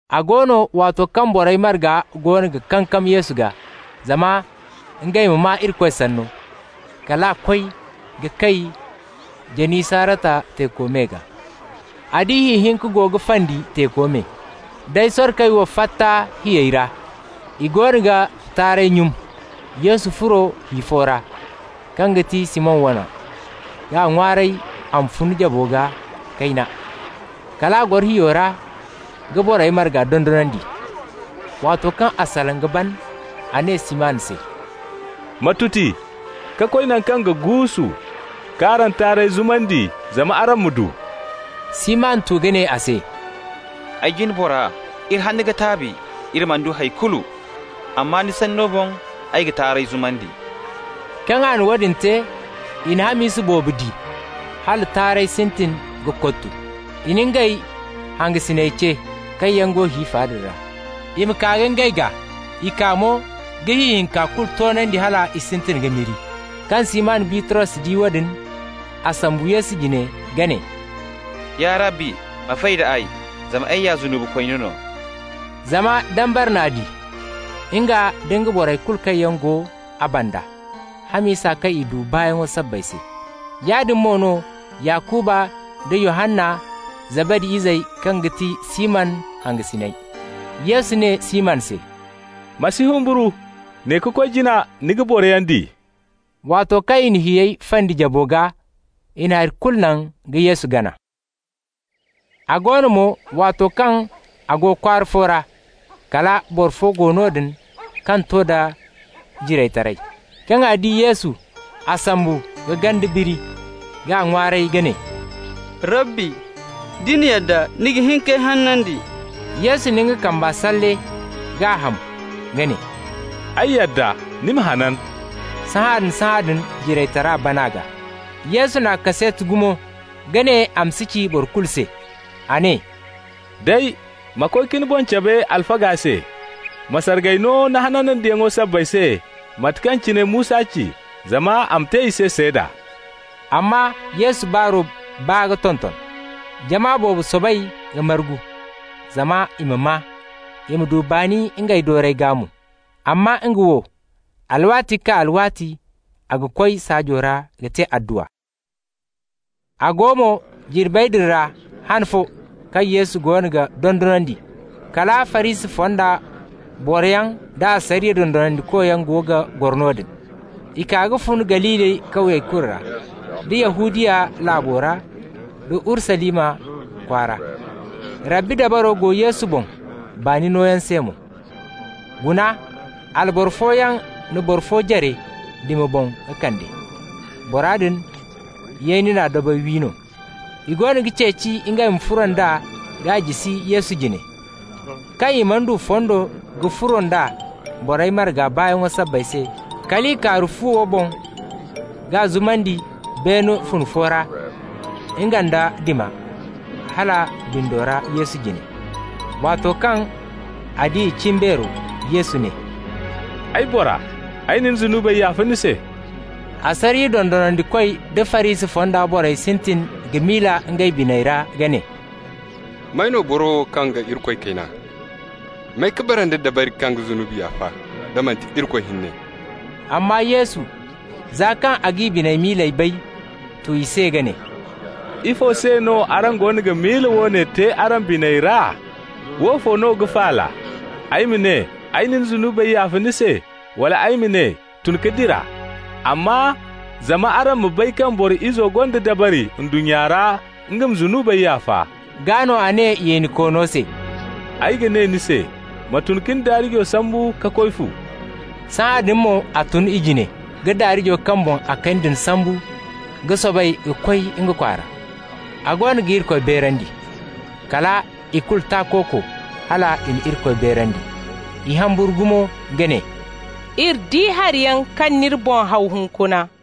A go no, waato kaŋ borey marga goono ga kankam Yesu gaa, zama ngey ma maa Irikoy Sanno, kal a koy ka kay Janisarata teeko me gaa. A di hi hinka go ga fandi teeko me. Day sorkey wo fatta hiyey ra, i goono ga taarey nyun. Yesu furo hi fo ra, kaŋ ga ti Siman wane, k'a ŋwaaray a ma fun jabo gaa kayna. Kal a goro hiyo ra ka borey marga dondonandi. Waato kaŋ a salaŋ ka ban, a ne Siman se: «Ma tuti ka koy naŋ kaŋ ga guusu, k'araŋ taarey zumandi zama araŋ ma du.» Siman tu ka ne a se: «Ay jine bora, iri hanna ka taabi, iri mana du hay kulu. Amma ni sanno boŋ ay ga taarey zumandi.» Kaŋ a na woodin te, i na hamisa boobo di, hala taarey sintin ka kottu. I na ngey hangasiney ce, kaŋ yaŋ go hi fa din ra, i ma kaa ka ngey gaa. I kaa mo, ka hi hinka kulu toonandi hal i sintin ka miri. Kaŋ Siman Bitros di woodin, a sombu Yesu jine ka ne: «Ya Rabbi, ma fay d'ay, zama ay ya zunubikooni no.» Zama dambara n'a di, nga nda borey kulu kaŋ yaŋ go a banda, hamisa kaŋ i du baayaŋo sabbay se. Yaadin mo no Yakuba nda Yohanna, Zabadi izey kaŋ ga ti Siman hangasiney. Yesu ne Siman se: «Ma si humburu. Ne ka koy jina ni ga boroyaŋ di.» Waato kaŋ i na hiyey fandi jabo gaa, i na hay kulu naŋ ka Yesu gana. A go no mo, waato kaŋ a go kwaara fo ra, kala boro fo go noodin kaŋ to nda jiraytaray. Kaŋ a di Yesu, a sombu ka ganda biri, k'a ŋwaaray ka ne: «Rabbi, da ni yadda, ni ga hin k'ay hanandi.» Yesu na nga kamba salle k'a ham ka ne: «Ay yadda. Ni ma hanan.» Sahãadin-sahãadin jiraytara ban a gaa. Yesu n'a kaseeti gumo ka ne a ma si ci boro kulu se. A ne: «Day, ma koy ka ni boŋ cabe alfaga se. Ma sargay no ni hanandiyaŋo sabbay se mate kaŋ cine Musa ci, zama a ma te i se seeda.» Amma Yesu baaro baa ka tonton. Jama boobo soobay ka margu zama i ma maa, i ma du baani ngey doorey gaa mo. Amma nga wo, alwaati ka kaa alwaati a ga koy saajo ra ka te adduwa. A go mo, jirbey din ra han fo, kaŋ Yesu goono ga dondonandi, kala Farisi fonda boroyaŋ nda asariya dondonandikoyaŋ go ga goro noodin. I kaa ka fun Galili kawye kulu ra, da Yahudiya laabo ra da Urusalima kwaara. Rabbi dabaro go Yesu boŋ baani nooyaŋ se mo. Guna, alboro fooyaŋ na boro fo jare dima boŋ ka kand'a. Bora din, yeeni na dabey wi no. I go ga ceeci ngey ma furo nd'a k'a jisi Yesu jine. Kaŋ i mana du fondo ka furo nd'a borey marga baayaŋ sabbay se, kal i kaaru fuwo boŋ k'a zumandi beene fune fo ra, nga nda dima, hala bindo ra Yesu jine. Waato kaŋ a di i cimbeero, Yesu ne: «Ay bora, ay na ni zunubey yaafa ni se.» Asariya dondonandikoy da Farisi fonda borey sintin ka miila ngey biney ra ka ne: «May no boro wo kaŋ ga Irikoy kayna? May ka bara nda dabari kaŋ ga zunubi yaafa da manti Irikoy hinne?» Amma Yesu, za kaŋ a g'i biney miiley bay, tu i se ka ne: «Ifo se no araŋ goono ga miila woone te araŋ biney ra? Woofo no ga faala, ay ma ne: ‹Ay na ni zunubey yaafa ni se,› wala ay ma ne: ‹Tun ka dira?› Amma, zama araŋ ma bay kaŋ Boro Izo gonda dabari ndunnya ra nga ma zunubey yaafa» (gaa no a ne yeenikoono se): «Ay ga ne ni se: Ma tun ka ni daarijo sambu ka koy fu.» Sahãadin mo a tun i jine ka daarijo kaŋ boŋ a kani din sambu ka soobay ka koy nga kwaara, a goono ga Irikoy beerandi. Kala i kulu takooko, hal i na Irikoy beerandi. I humburu gumo ka ne: «Iri di hariyaŋ kaŋ n'iri boŋ haw hunkuna.»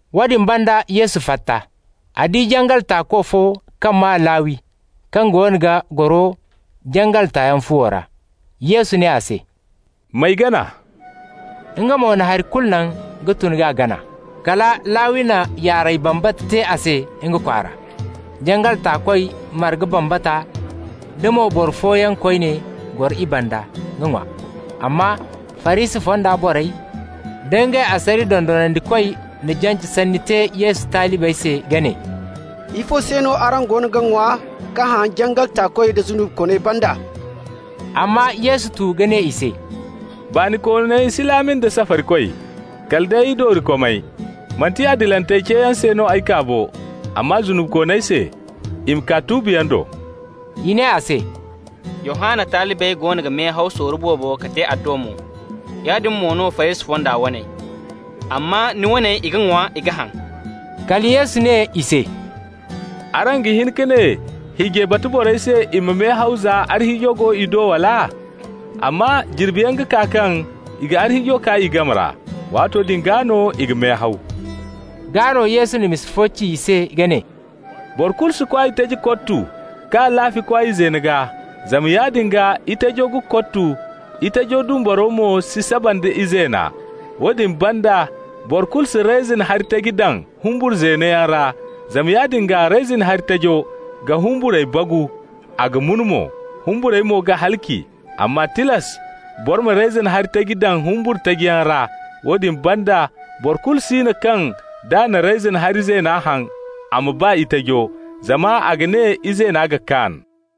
Woodin banda Yesu fatta. A di jangal taako fo kaŋ maa Lawi kaŋ goono ga goro jangal taayaŋ fuwo ra. Yesu ne a se: «M'ay gana.» Nga mo na hari kulu naŋ ka tun k'a gana. Kala Lawi na yaaray bambata te a se nga kwaara. Jangal taakoy marga bambata, da mo boro fooyaŋ koyne goro i banda ka ŋwa. Amma Farisi fonda borey da ngey asariya dondonandikoy na jance sanni te Yesu talibey se ka ne: «Ifo se no araŋ ga ŋwa ka haŋ jangal taakoy da zunubikooney banda?» Amma Yesu tu ka ne i se: «Baanikooney si laami nda safarikoy, kala day doorikomey. Manti adilantey ceeyaŋ se no ay kaa bo, amma zunubikooney se, i ma kaa tuubiyaŋ do.» I ne a se: «Yohanna talibey goono ga mehaw sorro boobo ka te adduwa mo. Yaadin mo no Farisi fonda waney. Amma ni waney, i ga ŋwa, i ga haŋ.» Kala Yesu ne i se: «Araŋ ga hin ka ne hiijay batu borey se i ma mehaw za arhiijo go i do, wala? Amma jirbiyaŋ ga kaa kaŋ i ga arhiijo kaa i game ra. Waato din gaa no i ga mehaw.» Gaa no Yesu na misa fo ci i se ka ne: «Boro kulu si kwaay taji kottu k'a laafi kwaay zeeno gaa. Zama yaadin gaa, itajo ga kottu, itajo dumbaro mo si saba nda izeena. Woodin banda, boro kulu si reyzin hari taji daŋ humbur zeeno yaŋ ra, zama yaadin gaa reyzin hari tajo ga humburey bagu, a ga mun mo. Humburey mo ga halaci. Amma tilas boro ma reyzin hari taji daŋ humbur taji yaŋ ra. Woodin banda, boro kulu si no kaŋ, d'a na reyzin hari zeena haŋ a ma ba itajo, zama a ga ne izeena ga kaan.»